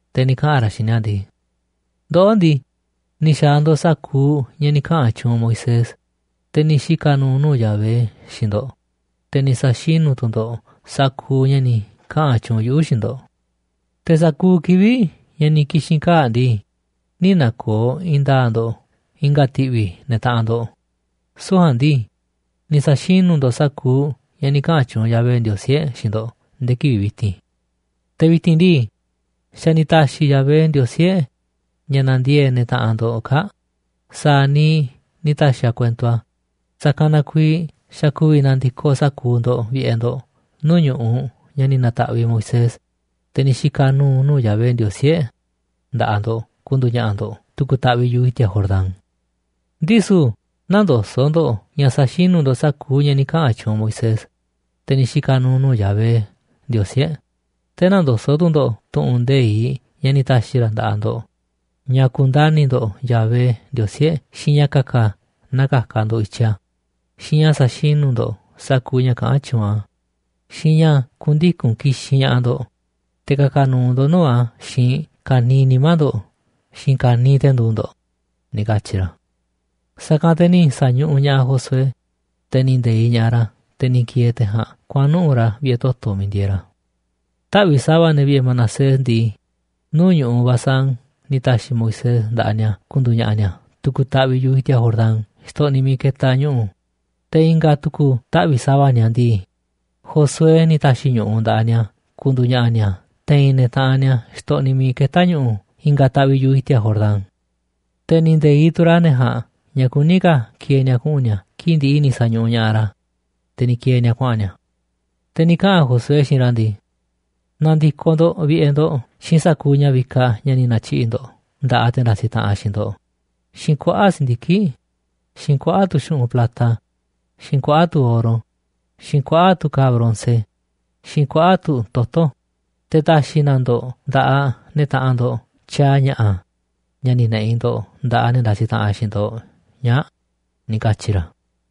te̱ ni̱ kaꞌa̱n ra̱ xiinꞌ ni̱a̱ ndii: ―Ndoꞌó ndii, ni̱ xa̱a̱ ndo̱ꞌ sa̱kuuꞌ ña̱ ni̱ kaꞌa̱n tyuunꞌ Moisés, te̱ ni̱ xika̱ nu̱u̱ nuu̱ꞌ Yahvé, xiinꞌ ndo̱ꞌ, te̱ ni̱ sa̱xinu̱ tu̱ ndo̱ꞌ sa̱kuuꞌ ña̱ ni̱ kaꞌa̱n tyuunꞌ yuꞌu̱ xiinꞌ ndo̱ꞌ. Te̱ sa̱kuuꞌ kivi̱ꞌ ña̱ ni̱ ki̱xi̱n kaa̱ꞌ ndii, nï̱ na̱ko̱o̱ i̱i̱n nda̱a̱ꞌ ndo̱ꞌ i̱nga̱ ti̱ꞌvi̱ ne̱ taꞌanꞌ ndo̱ꞌ, süu̱ꞌ ja̱a̱nꞌ ndii, ni̱ sa̱xinu̱ ndo̱ꞌ sa̱kuuꞌ ña̱ ni̱ kaꞌa̱n tyuunꞌ Yahvé Ndiosí e̱ꞌ xiinꞌ ndo̱ꞌ nde̱e̱ kivi̱ꞌ vi̱ti̱n. Te̱ vi̱ti̱n ndii, xa̱ ni̱ ta̱xi̱ Yahvé, Ndiosí e̱ꞌ, ña̱ na̱ndiee̱ꞌ ne̱ taꞌanꞌ ndo̱ꞌ kaa̱ꞌ sa̱a̱ niiꞌ ni̱ ta̱xi̱ a̱ kuento a̱, sa̱kanꞌ na kuiiꞌ xa̱ ku̱vi̱ na̱ndi̱koꞌ sa̱kuuꞌ ndo̱ꞌ vi̱ꞌe̱ ndo̱ꞌ nuu̱ꞌ ñu̱ꞌuꞌ ña̱ ni̱ na̱ta̱ꞌviꞌ Moisés, te̱ ni̱ xika̱ nu̱u̱ nuu̱ꞌ Yahvé, Ndiosí e̱ꞌ, nda̱ꞌaꞌ ndo̱ꞌ ku̱ndu̱u̱ ña̱ꞌa̱ ndo̱ꞌ tu̱ku̱ taꞌviꞌ yu̱ꞌuꞌ i̱ti̱a̱ Jordán. Ndisu̱ nä̱ndoso̱ꞌ ndo̱ꞌ ña̱ sa̱xinu̱ ndo̱ꞌ sa̱kuuꞌ ña̱ ni̱ kaꞌa̱n tyuunꞌ Moisés, te̱ ni̱ xika̱ nu̱u̱ nuu̱ꞌ Yahvé, Ndiosí e̱ꞌ. Te̱ nä̱ndoso̱ꞌ tu̱ ndo̱ꞌ tu̱ꞌu̱n nde̱iꞌ ña̱ ni̱ ta̱xi̱ ra̱ nda̱ꞌaꞌ ndo̱ꞌ ña̱ ku̱ndani̱ ndo̱ꞌ Yahvé, Ndiosí e̱ꞌ, xiinꞌ ña̱ ka̱ka̱ naa ka̱ka̱ ndo̱ꞌ i̱tyiꞌ a̱, xiinꞌ ña̱ sa̱xinu̱ ndo̱ꞌ sa̱kuuꞌ ña̱ kaꞌán tyuunꞌ a̱, xiinꞌ ña̱ ku̱ndiku̱n ki̱xinꞌ ña̱ꞌaꞌ ndo̱ꞌ, te̱ ka̱ka̱ nu̱u̱ ndo̱ꞌ nuu̱ꞌ a̱ xiinꞌ ka̱niiꞌ nimá ndo̱ꞌ xiinꞌ ka̱niiꞌ te̱ nduuꞌ ndo̱ꞌ ―ni̱ katyi̱ ra̱. Sa̱kanꞌ te̱ ni̱ sa̱ñuꞌuꞌ ña̱ꞌaꞌ Josué, te̱ ni̱ nde̱iꞌ ña̱ꞌaꞌ ra̱, te̱ ni̱ ki̱e̱e̱ te̱ ja̱a̱nꞌ kuaꞌa̱n nuꞌu̱ꞌ ra̱ vi̱ꞌe̱ toto̱ miiꞌ ndieeꞌ ra̱. Taꞌvi̱ꞌ sa̱va̱ ne̱ vi̱ꞌe̱ Manasés ndii, nuu̱ꞌ ñu̱ꞌuꞌ Basán ni̱ ta̱xi̱ Moisés nda̱ꞌaꞌ ni̱a̱ ku̱ndu̱u̱ ña̱ꞌa̱ ni̱a̱ tu̱ku̱ taꞌviꞌ yu̱ꞌuꞌ i̱ti̱a̱ Jordán xtoꞌniꞌ miiꞌ ketaꞌ ñu̱ꞌu̱, te̱ i̱nga̱ tu̱ku̱ taꞌvi̱ꞌ sa̱va̱ ni̱a̱ ndii, Josué ni̱ ta̱xi̱ ñu̱ꞌuꞌ nda̱ꞌaꞌ ni̱a̱ ku̱ndu̱u̱ ña̱ꞌa̱ ni̱a̱ te̱i̱n ne̱ taꞌanꞌ ni̱a̱ xtoꞌniꞌ miiꞌ ketá ñu̱ꞌu̱ i̱nga̱ taꞌviꞌ yu̱ꞌuꞌ i̱ti̱a̱ Jordán. Te̱ ni̱ nde̱iꞌ tu̱ ra̱ ne̱ ja̱a̱nꞌ ña̱ kuní ka̱ ki̱e̱e̱ ni̱a̱ kuꞌu̱n ni̱a̱ kii̱ꞌ ndi̱ꞌi̱ ni̱ sa̱ñuꞌuꞌ ña̱ꞌaꞌ ra̱, te̱ ni̱ ki̱e̱e̱ ni̱a̱ kuaꞌa̱n ni̱a̱. Te̱ ni̱ kaꞌa̱n Josué xiinꞌ ra̱ ndii: ―Na̱ndi̱koꞌ ndo̱ꞌ vi̱ꞌe̱ ndo̱ꞌ xiinꞌ sa̱kuuꞌ ña̱ vikaꞌ ña̱ ni̱ na̱tyiꞌi̱ꞌ ndo̱ꞌ nda̱ꞌaꞌ te̱ ndasiꞌ taꞌanꞌ xiinꞌ ndo̱ꞌ, xiinꞌ kuaꞌa̱ꞌ si̱ndiki̱ꞌ, xiinꞌ kuaꞌa̱ꞌ tu̱ xu̱ꞌunꞌ plata, xiinꞌ kuaꞌa̱ꞌ tu̱ oro, xiinꞌ kuaꞌa̱ꞌ tu̱ ka̱a̱ bronce, xiinꞌ kuaꞌa̱ꞌ tu̱ toto̱, te̱ ta̱xi̱ na ndo̱ꞌ nda̱ꞌaꞌ ne̱ taꞌanꞌ ndo̱ꞌ tyaaꞌ ña̱ꞌa̱, ña̱ ni̱ ne̱ꞌi̱ ndo̱ꞌ nda̱ꞌaꞌ ne̱ ndasiꞌ taꞌanꞌ xiinꞌ ndo̱ꞌ ñaa̱ꞌ ―ni̱ katyi̱ ra̱.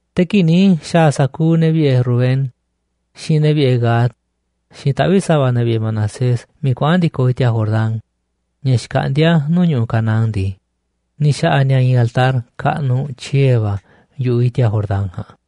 Te̱ kii̱ꞌ ni̱ xa̱a̱ sa̱kuuꞌ ne̱ vi̱ꞌe̱ Rubén, xiinꞌ ne̱ vi̱ꞌe̱ Gad, xiinꞌ taꞌvi̱ꞌ sa̱va̱ ne̱ vi̱ꞌe̱ Manasés miiꞌ kuaꞌa̱n ndi̱koꞌ i̱ti̱a̱ Jordán, ña̱ xkaꞌndíá nuu̱ꞌ ñu̱ꞌuꞌ Canaán ndii, ni̱ xa̱ꞌa̱ ni̱a̱ i̱i̱n altar kaꞌnuꞌ tyiee̱ va̱ yu̱ꞌuꞌ i̱ti̱a̱ Jordán ja̱a̱nꞌ.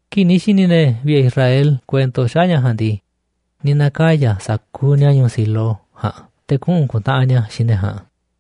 Kii̱ꞌ ni̱ xi̱ni̱ ne̱ vi̱ꞌe̱ Israel kuento xaꞌa̱ꞌ ña̱ ja̱a̱nꞌ ndii, ni̱ na̱kaya̱ sa̱kuuꞌ ni̱a̱ ñu̱u̱ Silo ja̱a̱nꞌ te̱ kuꞌu̱n ku̱ntaꞌanꞌ ni̱a̱ xiinꞌ ne̱ ja̱a̱nꞌ.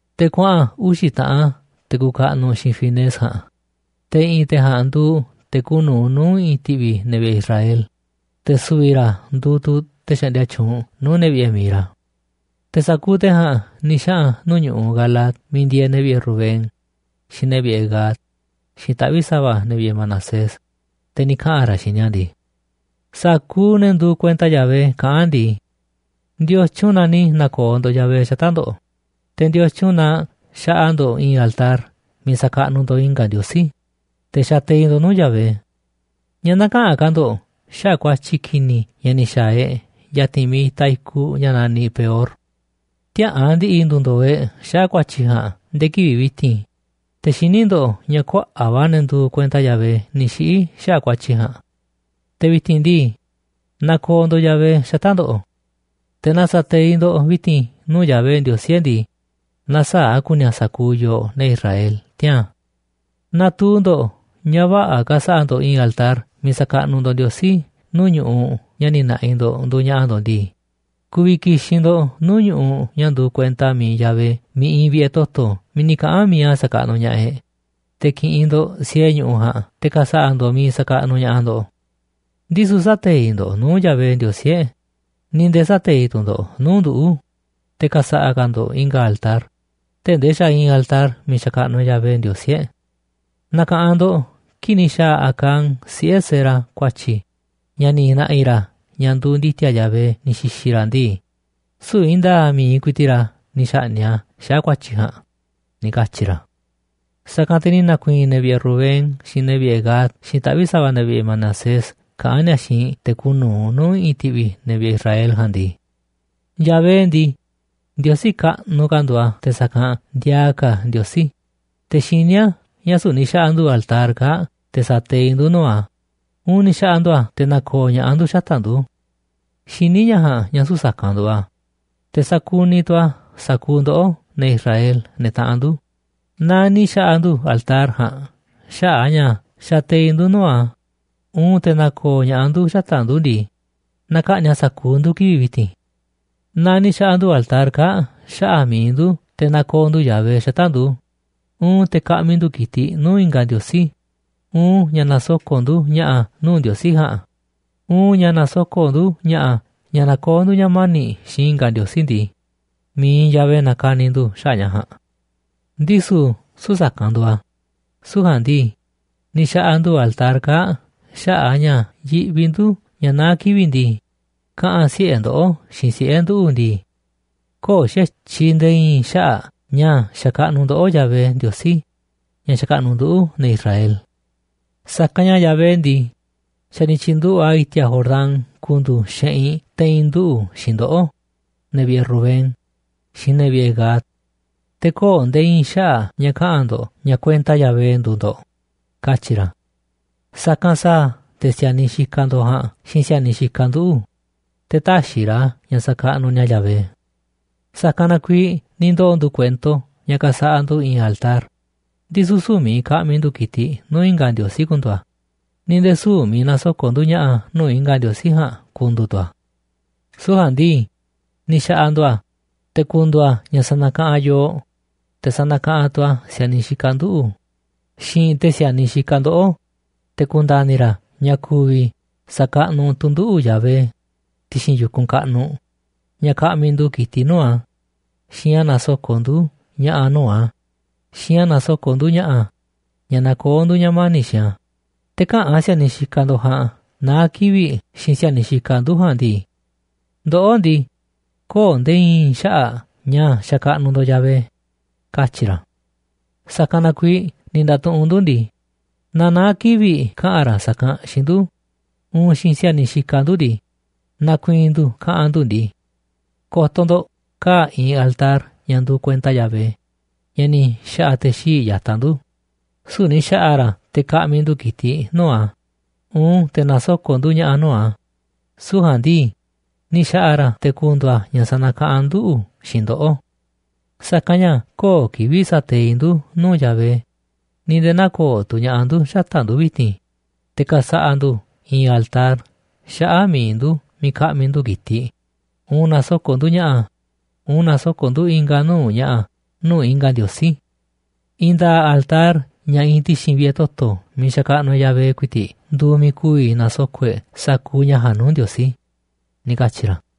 Te̱ kuaꞌa̱n uxi̱ taꞌan te̱ kuuꞌ kaꞌnuꞌ xiinꞌ Finees ja̱a̱nꞌ, te̱ i̱ꞌi̱n te̱ ja̱a̱nꞌ nduuꞌ te̱ kuuꞌ nu̱uꞌ nuu̱ꞌ i̱ꞌi̱n ti̱ꞌvi̱ ne̱ vi̱ꞌe̱ Israel, te̱ su̱vi̱ ra̱ nduuꞌ tu̱ te̱ xaꞌndia tyuunꞌ nuu̱ꞌ ne̱ vi̱ꞌe̱ mi̱iꞌ ra̱. Te̱ sa̱kuuꞌ te̱ ja̱a̱nꞌ ni̱ xaꞌa̱n nuu̱ꞌ ñu̱ꞌuꞌ Galaad miiꞌ ndieeꞌ ne̱ vi̱ꞌe̱ Rubén, xiinꞌ ne̱ vi̱ꞌe̱ Gad, xiinꞌ taꞌvi̱ꞌ sa̱va̱ ne̱ vi̱ꞌe̱ Manasés, te̱ ni̱ kaꞌa̱n ra̱ xiinꞌ ni̱a̱ ndii: ―Sa̱kuuꞌ ne̱ nduuꞌ kuenta Yahvé kaꞌán ndii: “¿Ndiotyun na ni̱ na̱ko̱o̱ ndo̱ꞌ Yahvé xata̱ꞌ ndo̱ꞌ? ¿Te̱ ndiotyun na xaꞌa ndo̱ꞌ i̱i̱n altar miiꞌ sa̱kaꞌnuꞌ ndo̱ꞌ i̱nga̱ ndiosí, te̱ xateiꞌ ndo̱ꞌ nuu̱ꞌ Yahvé? ¿Ñáá näkaꞌanꞌ ka̱ ndo̱ꞌ xaꞌa̱ꞌ ku̱a̱tyi̱ ki̱ni̱ ña̱ ni̱ xa̱a̱ e̱ꞌ ya̱ti̱n miiꞌ itaꞌ i̱kuꞌ ña̱ naniꞌ Peor? Tiäꞌa̱an ndi̱ꞌi̱ ndu̱ndo̱o̱ e̱ꞌ xaꞌa̱ꞌ ku̱a̱tyi̱ ja̱a̱nꞌ nde̱e̱ kivi̱ꞌ vi̱ti̱n, te̱ xiní ndo̱ꞌ ña̱ kuaꞌa̱ꞌ va̱ ne̱ nduuꞌ kuenta Yahvé ni̱ xiꞌi̱ xaꞌa̱ꞌ ku̱a̱tyi̱ ja̱a̱nꞌ. Te̱ vi̱ti̱n ndii, nakooꞌ ndo̱ꞌ Yahvé xata̱ꞌ ndo̱ꞌ. Te̱ naaꞌ sa̱teiꞌ ndo̱ꞌ vi̱ti̱n nuu̱ꞌ Yahvé, Ndiosí e̱ꞌ ndii, na̱saa̱ꞌ a̱ ku̱ni̱ a̱ sa̱kuuꞌ yooꞌ ne̱ Israel tiaa̱n. Naaꞌ tuu ndo̱ꞌ ña̱ vä̱ꞌa̱ ka̱sa̱ꞌa̱ ndo̱ꞌ i̱i̱n altar miiꞌ sa̱kaꞌnuꞌ ndo̱ꞌ Ndiosí nuu̱ꞌ ñu̱ꞌuꞌ ña̱ ni̱ na̱ꞌi̱ ndo̱ꞌ nduuꞌ ña̱ꞌa̱ ndo̱ꞌ ndii, ku̱vi̱ ki̱xi̱n ndo̱ꞌ nuu̱ꞌ ñu̱ꞌuꞌ ña̱ nduuꞌ kuenta mi̱iꞌ Yahvé miiꞌ iinꞌ vi̱ꞌe̱ toto̱ miiꞌ ni̱ kaꞌa̱n mi̱iꞌ a̱ sa̱kaꞌnuꞌ ña̱ꞌaꞌ e̱ꞌ, te̱ ki̱ꞌi̱n ndo̱ꞌ siee ñu̱ꞌuꞌ ja̱a̱nꞌ, te̱ ka̱sa̱ꞌa̱ ndo̱ꞌ miiꞌ sa̱kaꞌnuꞌ ña̱ꞌaꞌ ndo̱ꞌ. Ndisu̱ sä̱teiꞌ ndo̱ꞌ nuu̱ꞌ Yahvé, Ndiosí e̱ꞌ, ni̱ nde̱e̱ sä̱teiꞌ tu̱ ndo̱ꞌ nuu̱ꞌ nduꞌu̱, te̱ ka̱sa̱ꞌa̱ ka̱ ndo̱ꞌ i̱nga̱ altar, tee̱ꞌ ndee xa̱ iinꞌ altar miiꞌ xakaꞌnuꞌ e̱ꞌ Yahvé, Ndiosí e̱ꞌ. Na̱ka̱ꞌanꞌ ndo̱ꞌ kii̱ꞌ ni̱ xa̱a̱ Acán, siꞌe̱ Zera, ku̱a̱tyi̱ ña̱ ni̱ na̱ꞌi̱ ra̱ ña̱ nduuꞌ ndi̱ti̱a̱ Yahvé ni̱ xi̱xi̱ ra̱ ndii, süu̱ꞌ i̱i̱n nda̱a̱ꞌ mi̱iꞌ ku̱i̱ti̱ꞌ ra̱ ni̱ xa̱ꞌni̱ꞌ a̱ xaꞌa̱ꞌ ku̱a̱tyi̱ ja̱a̱nꞌ” ―ni̱ katyi̱ ra̱. Sa̱kanꞌ te̱ ni̱ na̱ku̱i̱i̱n ne̱ vi̱ꞌe̱ Rubén, xiinꞌ ne̱ vi̱ꞌe̱ Gad, xiinꞌ taꞌvi̱ꞌ sa̱va̱ ne̱ vi̱ꞌe̱ Manasés kaꞌán ni̱a̱ xiinꞌ te̱ kuuꞌ nu̱uꞌ nuu̱ꞌ i̱ꞌi̱n ti̱ꞌvi̱ ne̱ vi̱ꞌe̱ Israel ja̱a̱nꞌ ndii: ―Yahvé ndii, Ndiosí kaꞌnuꞌ ka̱ nduuꞌ a̱ te̱ sa̱kanꞌ ndiaa ka̱ ndiosí. Te̱ xiní a̱ ña̱ süu̱ꞌ ni̱ xa̱ꞌa̱ ndu̱ altar kaa̱ꞌ te̱ sa̱teiꞌ ndu̱ nuu̱ꞌ a̱, uun ni̱ xa̱ꞌa̱ ndu̱ a̱ te̱ na̱ko̱o̱ ña̱ꞌaꞌ ndu̱ xata̱ꞌ ndu̱. Xiní ña̱ ja̱a̱nꞌ ña̱ süu̱ꞌ sa̱kanꞌ nduuꞌ a̱, te̱ sa̱kuniꞌ tu̱ a̱ sa̱kuuꞌ ndoꞌó, ne̱ Israel, ne̱ taꞌanꞌ ndu̱. Naaꞌ ni̱ xa̱ꞌa̱ ndu̱ altar ja̱a̱nꞌ xaꞌa̱ꞌ a̱ ña̱ xateiꞌ ndu̱ nuu̱ꞌ a̱, uun te̱ na̱ko̱o̱ ña̱ꞌaꞌ ndu̱ xata̱ꞌ ndu̱ ndii, na ka̱ꞌni̱ꞌ a̱ sa̱kuuꞌ ndu̱ kivi̱ꞌ vi̱ti̱n. Naaꞌ ni̱ xa̱ꞌa̱ ndu̱ altar kaa̱ꞌ xaꞌa̱ꞌ mi̱iꞌ ndu̱ te̱ na̱ko̱o̱ ndu̱ Yahvé xata̱ꞌ ndu̱, uun te̱ ka̱ꞌmi̱ ndu̱ ki̱tiꞌ nuu̱ꞌ i̱nga̱ ndiosí, uun ña̱ na̱soko̱ꞌ ndu̱ ña̱ꞌa̱ nuu̱ꞌ ndiosí ja̱a̱nꞌ, uun ña̱ na̱soko̱ꞌ ndu̱ ña̱ꞌa̱ ña̱ na̱koo̱ ndu̱ ña̱ mani̱ꞌ xiinꞌ i̱nga̱ ndiosí ndii, mi̱iꞌ Yahvé na ka̱ni̱ ndu̱ xaꞌa̱ꞌ ña̱ ja̱a̱nꞌ. ’¡Ndisu̱ süu̱ꞌ sa̱kanꞌ nduuꞌ a̱! Süu̱ꞌ ja̱a̱nꞌ ndii, ni̱ xa̱ꞌa̱ ndu̱ altar kaa̱ꞌ xaꞌa̱ꞌ a̱ ña̱ yiꞌvi ndu̱ ña̱ naá kivi̱ꞌ ndii, kaꞌa̱n siꞌe̱ ndoꞌó xiinꞌ siꞌe̱ nduꞌu̱ ndii: “Köo̱ꞌ xa̱tyiꞌ nde̱e̱ i̱i̱n xaꞌa̱ꞌ ña̱ sa̱kaꞌnuꞌ ndoꞌó Yahvé, Ndiosí ña̱ xakaꞌnuꞌ nduꞌu̱, ne̱ Israel. Sa̱kanꞌ ña̱ Yahvé ndii, xa̱ ni̱ tyi̱nduꞌu̱ꞌ a̱ i̱ti̱a̱ Jordán ku̱ndu̱u̱ xeꞌinꞌ te̱i̱n nduꞌu̱ xiinꞌ ndoꞌó, ne̱ vi̱ꞌe̱ Rubén, xiinꞌ ne̱ vi̱ꞌe̱ Gad. Te̱ köo̱ꞌ nde̱e̱ i̱i̱n xaꞌa̱ꞌ ña̱ kaꞌa̱n ndo̱ꞌ ña̱ kuenta Yahvé nduuꞌ ndo̱ꞌ”, katyi̱ ra̱. Sa̱kanꞌ sa̱a̱ te̱ si̱a̱niꞌ xikaꞌ ndo̱ꞌ ja̱a̱nꞌ xiinꞌ si̱a̱niꞌ xikaꞌ nduꞌu̱, te̱ tä̱xi̱ ra̱ ña̱ sa̱kaꞌnuꞌ ni̱a̱ Yahvé. ’Sa̱kanꞌ na kuiiꞌ ni̱ ndoo̱ ndu̱ kuento ña̱ ka̱sa̱ꞌa̱ ndu̱ i̱i̱n altar, ndisu̱ süu̱ꞌ miiꞌ ka̱ꞌmi̱ ndu̱ ki̱tiꞌ nuu̱ꞌ i̱nga̱ ndiosí ku̱ndu̱u̱ a̱, ni̱ nde̱e̱ süu̱ꞌ miiꞌ na̱soko̱ꞌ ndu̱ ña̱ꞌa̱ nuu̱ꞌ i̱nga̱ ndiosí ja̱a̱nꞌ ku̱ndu̱u̱ tu̱ a̱. Süu̱ꞌ ja̱a̱nꞌ ndii, ni̱ xa̱ꞌa̱ ndu̱ a̱ te̱ ku̱ndu̱u̱ a̱ ña̱ sa̱na̱kaꞌanꞌ yooꞌ, te̱ sa̱na̱kaꞌanꞌ tu̱ a̱ si̱a̱niꞌ xikaꞌ nduꞌu̱ xiinꞌ te̱ si̱a̱niꞌ xikaꞌ ndoꞌó, te̱ ku̱nda̱ni̱ ra̱ ña̱ ku̱vi̱ sa̱kaꞌnuꞌ tu̱ nduꞌu̱ Yahvé ti̱xi̱n yu̱kunꞌ kaꞌnuꞌ, ña̱ ka̱ꞌmi̱ ndu̱ ki̱tiꞌ nuu̱ꞌ a̱, xiinꞌ ña̱ na̱soko̱ꞌ ndu̱ ña̱ꞌa̱ nuu̱ꞌ a̱, xiinꞌ ña̱ na̱soko̱ꞌ ndu̱ ña̱ꞌa̱, ña̱ nakoó ndu̱ ña̱ mani̱ꞌ xiinꞌ a̱, te̱ käꞌa̱n si̱a̱niꞌ xikaꞌ ndo̱ꞌ ja̱a̱nꞌ naá kivi̱ꞌ xiinꞌ si̱a̱niꞌ xikaꞌ ndu̱ ja̱a̱nꞌ ndii: “Ndoꞌó ndii, köo̱ꞌ nde̱e̱ i̱i̱n xaꞌa̱ꞌ ña̱ sa̱kaꞌnuꞌ ndo̱ꞌ Yahvé”, katyi̱ ra̱. ’Sa̱kanꞌ na kuiiꞌ ni̱ nda̱tuꞌunꞌ ndu̱ ndii: Naaꞌ naá kivi̱ꞌ kaꞌa̱n ra̱ sa̱kanꞌ xiinꞌ ndu̱, uun xiinꞌ si̱a̱niꞌ xikaꞌ ndu̱ ndii, na̱ku̱i̱i̱n ndu̱ kaꞌa̱n ndu̱ ndii: “Ko̱to̱ ndo̱ꞌ, kaa̱ꞌ iinꞌ altar ña̱ nduuꞌ kuenta Yahvé, ña̱ ni̱ xa̱ꞌa̱ te̱ xii̱ꞌ ya̱taꞌ ndu̱, süu̱ꞌ ni̱ xa̱ꞌa̱ ra̱ a̱ te̱ ka̱ꞌmi̱ ndu̱ ki̱tiꞌ nuu̱ꞌ a̱, uun te̱ na̱soko̱ꞌ ndu̱ ña̱ꞌa̱ nuu̱ꞌ a̱, süu̱ꞌ ja̱a̱nꞌ ndii, ni̱ xa̱ꞌa̱ ra̱ a̱ te̱ ku̱ndu̱u̱ a̱ ña̱ sa̱na̱kaꞌanꞌ nduꞌu̱ xiinꞌ ndoꞌó. Sa̱kanꞌ ña̱ köo̱ꞌ kivi̱ꞌ sa̱teiꞌ ndu̱ nuu̱ꞌ Yahvé, ni̱ nde̱e̱ nä̱ko̱o̱ tu̱ ña̱ꞌaꞌ ndu̱ xata̱ꞌ ndu̱ vi̱ti̱n, te̱ ka̱sa̱ꞌa̱ ndu̱ i̱i̱n altar xaꞌa̱ꞌ mi̱iꞌ ndu̱ miiꞌ ka̱ꞌmi̱ ndu̱ ki̱tiꞌ, uun na̱soko̱ꞌ ndu̱ ña̱ꞌa̱, uun na̱soko̱ꞌ ndu̱ i̱nga̱ nuu̱ꞌ ña̱ꞌa̱ nuu̱ꞌ i̱nga̱ ndiosí. I̱i̱n nda̱a̱ꞌ altar ña̱ iinꞌ ti̱xi̱n vi̱ꞌe̱ toto̱ miiꞌ xakaꞌnuꞌ e̱ꞌ Yahvé ku̱i̱ti̱ꞌ nduuꞌ miiꞌ ku̱vi̱ na̱soko̱ꞌ e̱ꞌ sa̱kuuꞌ ña̱ ja̱a̱nꞌ nuu̱ꞌ Ndiosí” ―ni̱ katyi̱ ra̱.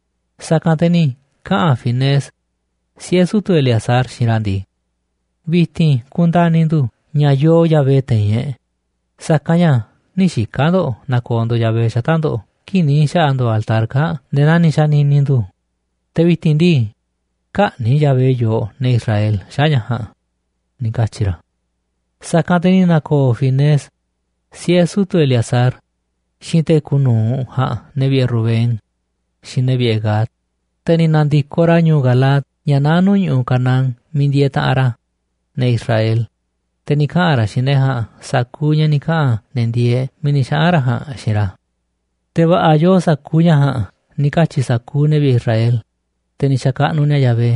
Sa̱kanꞌ te̱ ni̱ kaꞌa̱n Finees, siꞌe̱ sutu̱ Eleazar, xiinꞌ ra̱ ndii: ―Vi̱ti̱n ku̱ndani̱ ndu̱ ña̱ yoo Yahvé te̱i̱n e̱ꞌ, sa̱kanꞌ ña̱ nï̱ xika̱ ndo̱ꞌ na̱ko̱o̱ ndo̱ꞌ Yahvé xata̱ꞌ ndo̱ꞌ kii̱ꞌ ni̱ xa̱ꞌa̱ ndo̱ꞌ altar kaa̱ꞌ nde̱e̱ naa ni̱ xa̱ni̱ni̱ ndu̱. Te̱ vi̱ti̱n ndii, kä̱ꞌni̱ꞌ Yahvé yooꞌ, ne̱ Israel, xaꞌa̱ꞌ ña̱ ja̱a̱nꞌ ―ni̱ katyi̱ ra̱. Sa̱kanꞌ te̱ ni̱ na̱ko̱o̱ Finees, siꞌe̱ sutu̱ Eleazar, xiinꞌ te̱ kuuꞌ nu̱uꞌ ja̱a̱nꞌ ne̱ vi̱ꞌe̱ Rubén, xiinꞌ ne̱ vi̱ꞌe̱ Gad, te̱ ni̱ na̱ndi̱koꞌ ra̱ ñu̱u̱ Galaad, ña̱ naá nuu̱ꞌ Canaán, miiꞌ ndieeꞌ taꞌanꞌ ra̱, ne̱ Israel. Te̱ ni̱ kaꞌa̱n ra̱ xiinꞌ ne̱ ja̱a̱nꞌ sa̱kuuꞌ ña̱ ni̱ kaꞌa̱n ne̱ ndieeꞌ miiꞌ ni̱ xaꞌa̱n na̱ ja̱a̱nꞌ xiinꞌ ra̱. Te̱ va̱ꞌa̱ yoo sa̱kuuꞌ ña̱ ja̱a̱nꞌ ni̱ katyi̱ sa̱kuuꞌ ne̱ vi̱ꞌe̱ Israel, te̱ ni̱ xa̱kaꞌnuꞌ ni̱a̱ Yahvé,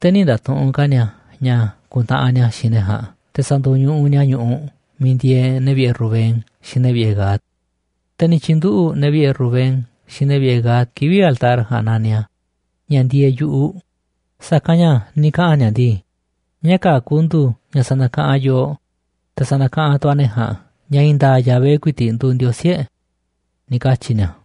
te̱ nï̱ nda̱tuꞌunꞌ ka̱ ni̱a̱ ña̱ ku̱ntaꞌanꞌ ni̱a̱ xiinꞌ ne̱ ja̱a̱nꞌ te̱ sa̱ndo̱ñuꞌuꞌ ni̱a̱ ñu̱ꞌuꞌ miiꞌ ndieeꞌ ne̱ vi̱ꞌe̱ Rubén xiinꞌ ne̱ vi̱ꞌe̱ Gad. Te̱ ni̱ tyi̱nduꞌu̱ꞌ ne̱ vi̱ꞌe̱ Rubén xiinꞌ ne̱ vi̱ꞌe̱ Gad kivi̱ꞌ altar ja̱a̱nꞌ naniꞌ a̱, “ña̱ ndieeꞌ yu̱ꞌuꞌ”, sa̱kanꞌ ña̱ ni̱ kaꞌa̱n ni̱a̱ ndii: “Ña̱ kaa̱ꞌ ku̱ndu̱u̱ ña̱ sa̱na̱kaꞌanꞌ yooꞌ, te̱ sa̱na̱kaꞌanꞌ tu̱ a̱ ne̱ ja̱a̱nꞌ ña̱ i̱i̱n nda̱a̱ꞌ Yahvé ku̱i̱ti̱ꞌ nduuꞌ Ndiosí e̱ꞌ”, ni̱ katyi̱ ni̱a̱.